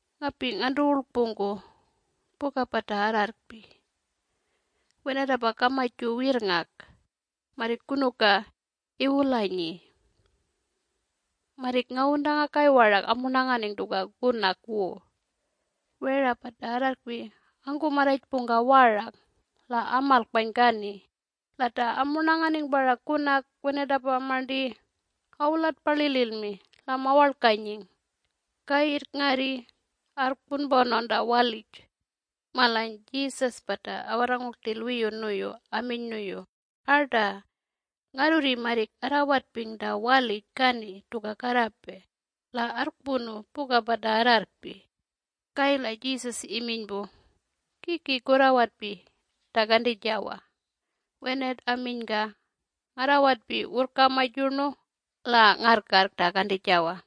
“Ngapi ngantuwurlkpungku puka pata arrarrkpi. Wenatapa kamaju wirrngak marrik kunuka iwulanyi! Marrik ngawuntangakay warak amurnanganing tuka kunak wu. Wera pata arrarrkpi angkumarrajpungka warak la amalkpany kani la ta amurnanganing parak kunak wenatapa marnti awulatpalililmi la mawarlkanying. Kayirrk ngarrurri arrkpunpanawn ta walij.” Malany Jesus pata awarrangung rtil wiyu nuyu aminy nuyu, “Arta! Ngarrurri marrik arrawetping ta walij kani tuka karrapey la arrkpunu puka pata arrarrkpi.” Kayirrk Jesus iminy pu, “Kiki kurrawatpi ta kantijawa?” Wenat aminyka, “Ngarrawatpi wurrkamaj yurnu la ngarrkarrk ta kantijawa.”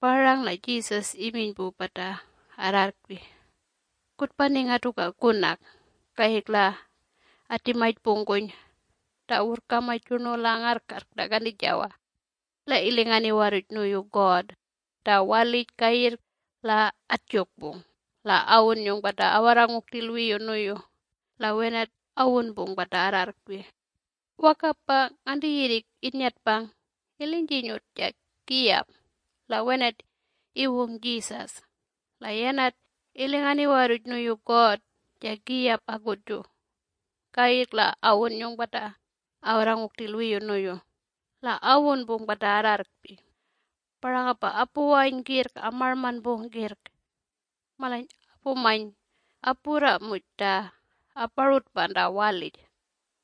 Parang la Jesus iminy pu pata arrarrkpi, “Kutpaninga tuka kunak.” Kayirrk la atimajpungkuny ta wurrkamaj yurnu la ngarrarrk ta kantijawa la ilingan iwarruj nuyu God ta walij kayirrk la atjukpung la awunnyung pata awarrangung rtil wiyu nuyu la wenat awunpung pata arrarrkpi. Wakapa nganti yirrik innyatpang ilinjinyut ja kiyap la wenat iwung Jesus. La yanat ilingan iwarruj nuyu God ja kiyap akutju, kayirrk la awunnyung pata awarrangung rtil wiyu nuyu la awunpung pata arrarrkpi. Parangapa apuwany kirrk amarlmanpung kirrk. Malany apumany apurra muj ta aparutpakpan ta walij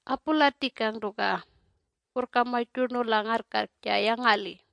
apulatikang tuka wurrkamaj yurnu la ngarrkarrk ja yangali.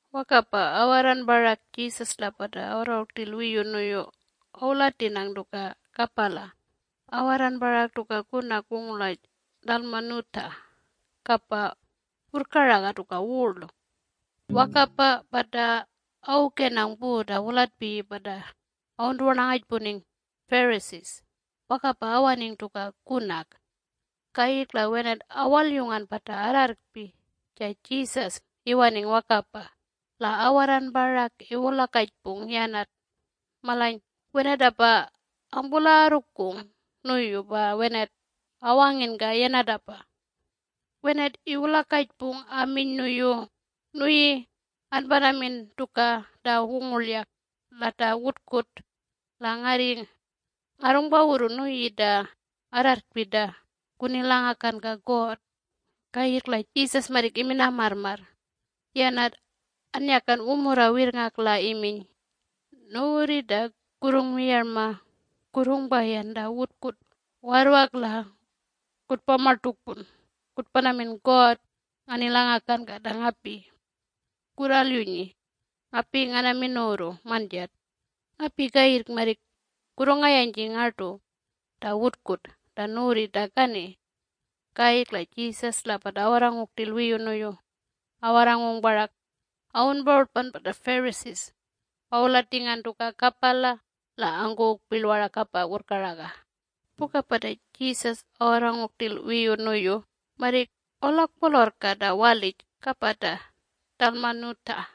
Wakapa awarran parak Jesus la pata awarrangung rtil wiyu nuyu awulatinang tuka kapala awarran parak tuka kunak wungurlaj Dalmanutha kapa wurrkaraga tuka wurl. Wakapa pata awukenang pu ta wulatpiyi pata awuntuwarnangajpuning Pharisees wakapa awaning tuka kunak. Kayirrk la wenat awalyungan pata arrarrkpi ja Jesus iwaning wakapa la awarran parak iwulakajpung yanat. Malany wenatapa angpulagarrukung nuyu pa wenat awanginka yanatapa. Wenat iwalakajpung aminy nuyu, “Nuyi anpanamin tuka ta wungurlyak la ta wutkut, la ngarri ngarrungpawurrun nuyi ta arrarrkpi ta kunilangakanka God.” Kayirrk la Jesus marrik imina marrmarr, yanat annyakan wumurra wirrngak la iminy, “Nuwurri ta kurrungmiyarma kurrungpayan ta wutkut warrwak la kutpamartukpun kutpanamin God nganilangakanka ta ngapi. Kurralyunyi! Ngapi nganamin nuwurru manjat. Ngapi kayirrk marrik kurrungayanjing ngartu ta wutkut ta nuwurri ta kani.” Kayirrk la Jesus la pata awarrangung rtil wiyu nuyu awarrangung parak awunparutpan pata Pharisees awulatingan tuka kapala la angkuwung pirl warak kapa wurrkaraga. Puka pata Jesus awarrangung rtil wiyu nuyu marrik awularrkpolorrka ta walij kapa ta Dalmanutha.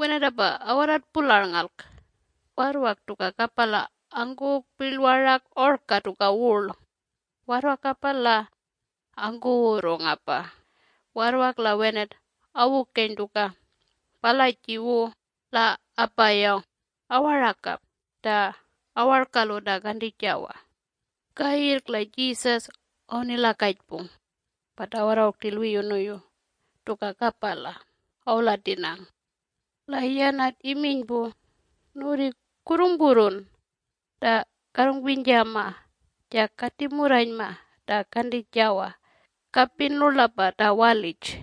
Wenatapa awarran pularngarlk. Warrwak tuka kapala angkuwung pirl warak orka tuka wurl, warrwakapa la angkuwurrungapa. Warrwak la wenat awukeny tuka palaji wu la apayawng awarakap ta awarkalu ta kantijawa. Kayirrk la Jesus awunilakajpung pata awarrangung rtil wiyu nuyu tuka kapala awulatinang. La yanat iminy pu, “Nuwurri kurrungpurrun ta karrungminyjama ja katimurranyma ta kantijawa kapin rlurlapa ta walij.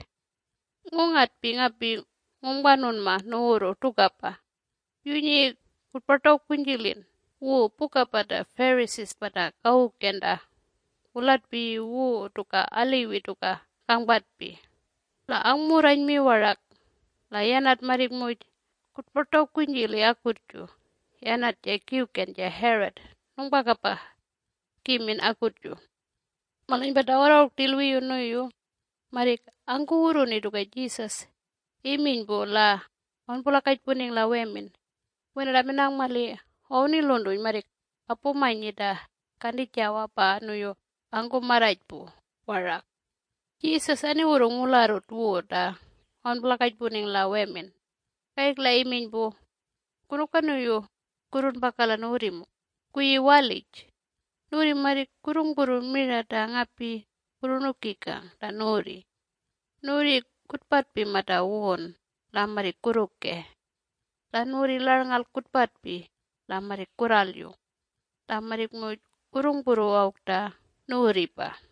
Ngungatpi, ngapi ngungpanunma nuwurru tukapa, yunyi kutpartawkunyjilin wu puka pata Pharisee pata kawuken ta wulatpiyi wu tuka aliwi tuka kangpatpi la angmurranymi warak, la yanat marrik muj kutpartawkunyjili akutju yanat ja Kiwken ja Herod nungpakapa kimin akutju. Malany pata awarrangung rtil wiyu nuyu marrik angkuwurruni tuka Jesus iminy pu la awunpulakajpuning la wemin. Wenat aminang mali awuniluntuny marrik apumanyi ta kantijawa pa nuyu angkumarrajpu warak. Jesus aniwurrung wularrut wu ta awunpulakajpuning la wemin kayirrk la iminy pu, “Kunuka nuyu kurrunpaka la nuwurrimung kuyi walij? Nuwurri marrik kurrungpurru mira ta ngapi kurrunukikang ta nuwurri. Nuwurri kutpatpi mata wun la marrik kurrukey. La nuwurri larnngalk kutpatpi la marrik kurralyung. La marrik muj kurrungpurru awk ta nuwurripa.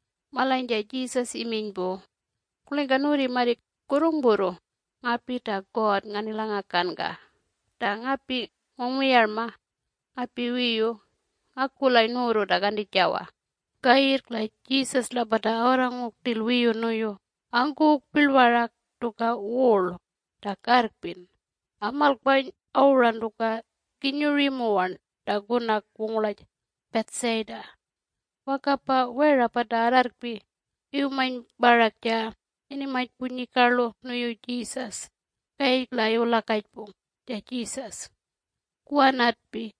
Malany ja Jesus iminy pu, “Kurlingka nuwurri marrik kurrungpurru ngapi ta God nganilangakanka? Ta ngapi nungmiyarma ngapi wiyu ngakulay nuwurru ta kantijawa.” Kayirrk la Jesus la pata awarrangung rtil wiyu nuyu angkuwung pirl parak tuka wurl ta karrkpin amalkpany awuran tuka kinyuryi muwarn ta kunak wungurlaj Bethsaida. Wakapa wera pata arrarrkpi iwumany parak ja inimany punyikarlu nuyu Jesus kayirrk la iwulakajpung ja Jesus, “Kuwanatpi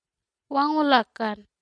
kuwangulakan.”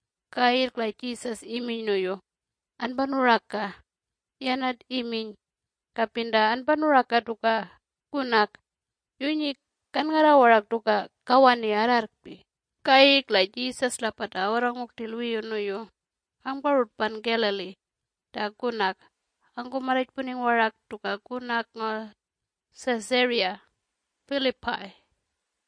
Kayirrk la Jesus iminy nuyu, “Anpanuraka!” Yanat iminy, “Kapin ta anpanuraka tuka kunak, yunyi kanngarra warak tuka kawani arrarrkpi.” Kayirrk la Jesus la pata awarrangung rtil wiyu nuyu angparutpan Galilee ta kunak angkumarrajpuning warak tuka kunak ngaw Caesarea Phillipi.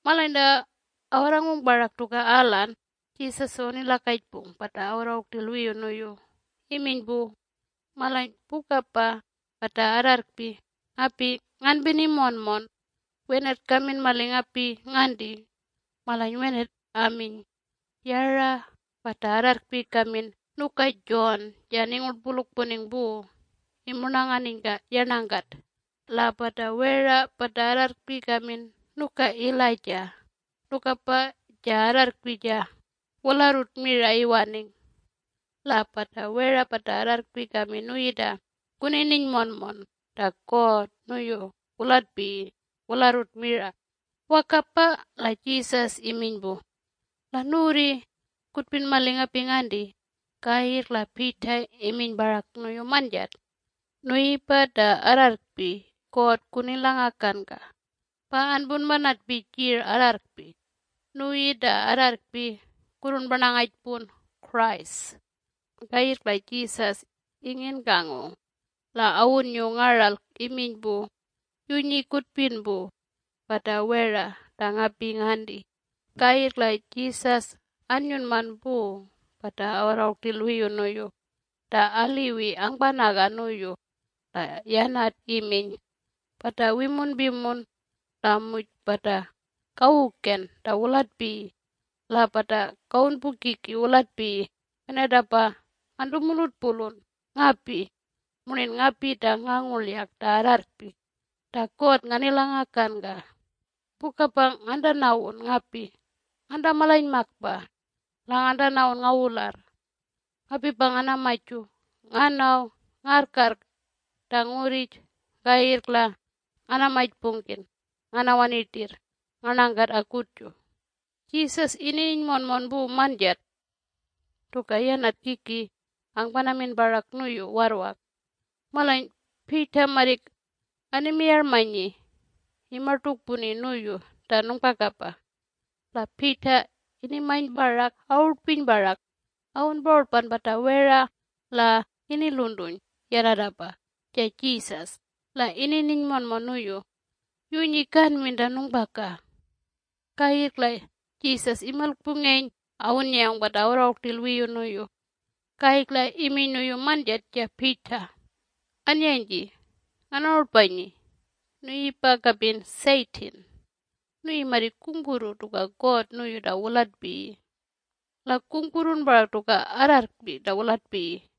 Malany ta awarrangung parak tuka alan Jesus awunilakajpung pata awarrangung rtil wiyu nuyu iminy pu, “Malany pukapa pata arrarrkpi ngapi nganpini monmon, wenat kamin mali ngapi nganti?” Malany wenat aminy, “Yara pata arrarrkpi kamin nuka John ja aningurtpulukpuning pu imurnanganinyka yarnangkat. La pata wera pata arrarrkpi kamin nuka Elijah nukapa ja arrarrkpi ja wularrut mira iwaning. La pata wera pata arrarrkpi kamin nuyi ta kunininy monmon ta God nuyu wulatpiyi wularrut mira.” Wakapa la Jesus iminy pu, “La nuwurri kutpin mali ta ngapi nganti?” Kayirrk la Peter iminy parak nuyu manjat, “Nuyipa ta arrarrkpi God kunilangakanka pa anpunpanatpi jir arrarrkpi - nuyi ta arrarrkpi kurrunparnangajpun ‘Christ’.” Kayirrk la Jesus inginkangung la awunnyung ngaralk iminy pu, “Yunyi kutpin pu pata wera ta ngapi nganti!” Kayirrk la Jesus annyunman pu pata awarrangung rtil wiyu nuyu ta aliwi angpanaga nuyu la yanat iminy, “Pata wimunpimun la muj pata kawuken ta wulatpiyi la pata kawunpukiki wulatpiyi wenatapa ngantumulutpulun ngapi murnin ngapi ta ngangurlyak ta arrarrkpi ta God nganilangakanka. Pukapa ngantanawun ngapi ngantamalanymakpa la ngantanawun ngawularr. Ngapipa nganamaju nganaw ngarrkarrk ta ngurrij, kayirrk la nganamajpungkin nganawani rtirr ngarnangkat akutju.” Jesus inininy monmon pu manjat tuka yanat kiki angpanamin parak nuyu warrwak. Malany Peter marrik animiyarmanyi imartukpuni nuyu ta nungpakapa. La Peter inimany parak awurtpiny parak awunparutpan pata wera la iniluntuny yanatapa ja Jesus la inininy monmon nuyu, “Yunyi kanmin ta nungpaka.” Kayirrk la Jesus imilkpungeny awunnyayawng pata awarrangung rtil wiyu nuyu, kayirrk la iminy nuyu manjat ja Peter, “Annyanyji nganarutpanyi! Nuyipa kapin Satan! Nuyi marrik kungpurru tuka God nuyu ta wulatpiyi la kungpurrun parak tuka arrarrkpi ta wulatpiyi.”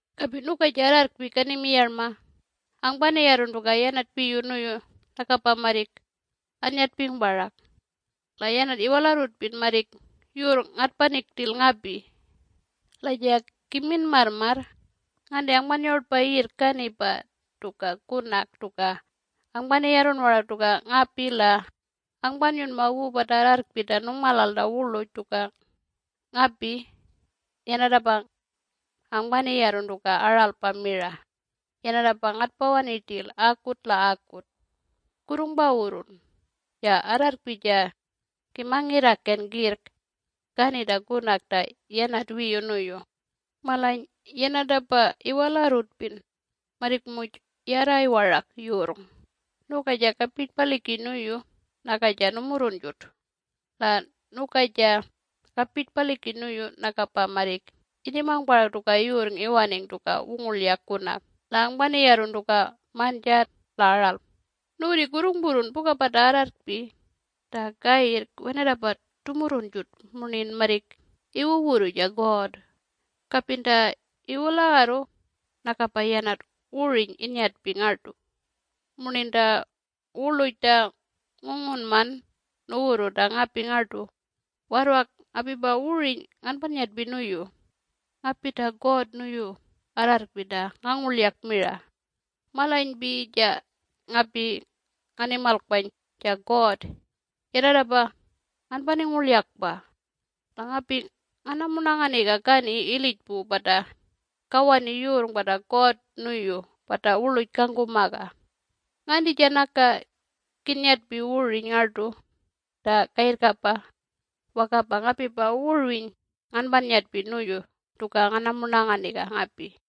Kapin nuka ja arrarrkpi kanimiyarma angpaniyarrun tuka yanat piyu nuyu nakapa marrik annyatping parak - la yanatapa iwalarrutpin marrik yurrng ngatpaning rtil ngapi. La ja kimin marrmarr nganti angpannyarutpa yirrk kani pa tuka kunak-tuka angpaniyarrun warak tuka ngapi la angpanyunma wu pata arrarrkpi ta nungmalal ta wurluj tuka ngapi-yanatapa angpaniyarrun tuka aralpa mira-yanatapa ngatpawani rtil akut la akut. Kurrungpawurrun, ja arrarrkpi ja kimangirrakan kirrk kani ta kunak ta yanat wiyu nuyu, malany yanatapa iwalarrutpin marrik muj yarray warak yurrng, nuka ja kapirtpalikin nuyu naka ja numurrunjut. La nuka ja kapirtpalikin nuyu nakapa marrik inimang parak tuka yurrng iwaning tuka wungurlyak kunak la angpaniyarrun tuka manjat la aralpa. Nuwurri kurrungpurrun puka pata arrarrkpi ta kayirrk wenatapa tumurrunjut murnin marrik iwuwurru ja God. Kapin ta iwulagarru nakapa yanat wurwiny inyatping ngartu murnin ta wurluj ta ngungunman nuwurru ta ngapi ngartu, warrwak ngapipa wurwiny nganpanyatpi nuyu. Ngapi ta God nuyu arrarrkpi ta ngangurlyak mira, Malanypi ja ngapi nganimalkpany, ja God, yanatapa nganpaningurlyakpa, la ngapi ngatpamurnanganiga kani ilij pu pata kawani yurrng pata God nuyu pata wurluj kangkumaga. Nganti ja naka kinnyatpi wurwiny ngartu ta kayirrkapa, wakapa ngapipa wurwiny nganpanyatpi nuyu tuka nganamurnanganiga ngapi.”